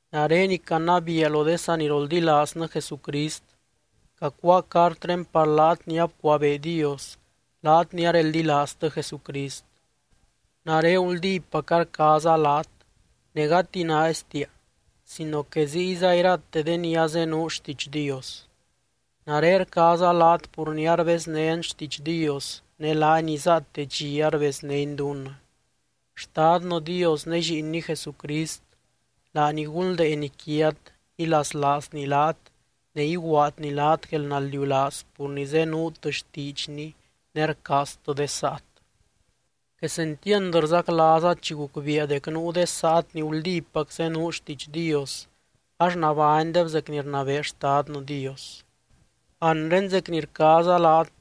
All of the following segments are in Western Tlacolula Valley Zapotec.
Nare ni canabiia lo de saniroldilaaznɨ Jesucrist, cacuáa cartré par laat ni abcuabee Dios, laat ni areldilaaztɨ Jesucrist. Nare guldípaca rcaaza laat ne gati naaistia, sino que ziyza irate de ni azenuu xtiidx Dios. Nare rcaaza laat pur ni arbeznén xtiidx Dios ne laany izaate dxi arbeznény dunnɨ. Xtadnɨ Dios ne Lliinny Jesucrist, laany gunldeeny quiat, ilaslaazny laat ne iguaadny laat guelnaldiulaaz pur ni zenuut xtiidxny ne rcaaztɨ de saat. Quesentiand rzaclaaza chi gucbiia dec nuu de saat ni guldípac zenuu xtiidx Dios, ax nabánydeb zec ni rnabee Xtadnɨ Dios. Anre zec ni rcaaza laat,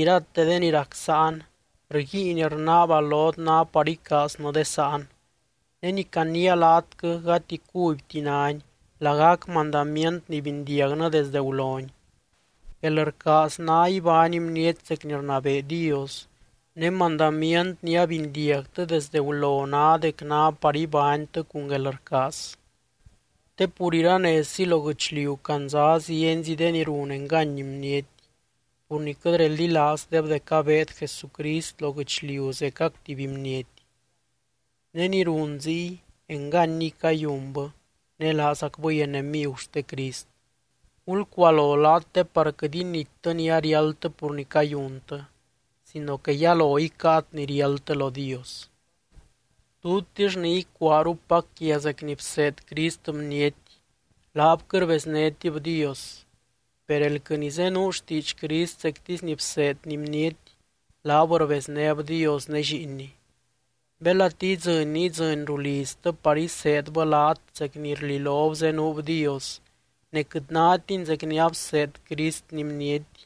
irate de ni rac sáan, rguiin rnaaba lot ná par icaaznɨ de sáan. Ne ni caniia laatquɨ, gati cubyti náni, lagac mandamient ni bindiagnɨ desde guloni. Guelrcaaz ná ibány bniety zec ni rnabee Dios, ne mandamient ni abindiagtɨ desde gulo ná dec ná par ibánytɨ cun guelrcaaz. Te pur iranezzi lo guɨchliu candza zienzi de ni run engany bniety, pur ni quɨt reldilaazdeb dec abeed Jesucrist lo guɨchliu zecac tuby bniety. Ne ni run ziy, enganiy cayunbɨ ne laazacbɨy enemigu xte Crist. Gulcualo laat te par quɨt inittɨ ni ariáldtɨ pur ni cayuntɨ, sino que yalo icáat ni riáldtɨ lo Dios. Tutix ni icuaarupac quia zec ni bseed Crist bniety, laab quɨt rbeznétib Dios. Per elquɨ ni zenuu xtiidx Crist zectisy ni bseedny bniety, laab rbeznéb Dios ne Lliinny. Belati idzɨny ni idzɨny ruu liztɨ par iseedbɨ laat zec ni rlilob zenuub Dios ne quɨt nátini zec ni abseed Cristni bniety,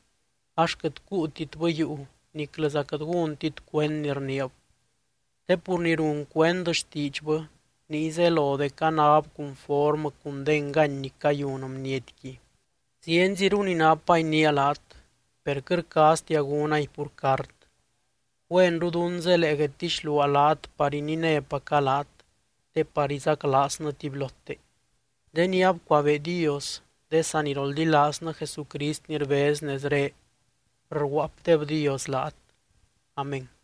ax quɨt cuutitbɨ yuu niclɨza quɨt gúntit cuend ni rniib. Te pur ni run cuend xtiidxbɨ, niy zelo dec anáb cunformɨ cun de engany ni cayun bnietqui. Zienziru ni napa iniia laat, per quɨt rcaaztia gúnay pur cart. Güenru dún zelee guedtixluaa laat par ininépaca laat te par izaclaaznɨ tubylote. De ni abcuabee Dios, de saniroldilaaznɨ Jesucrist ni rbez nezré, rguaapdebdios laat. Amén.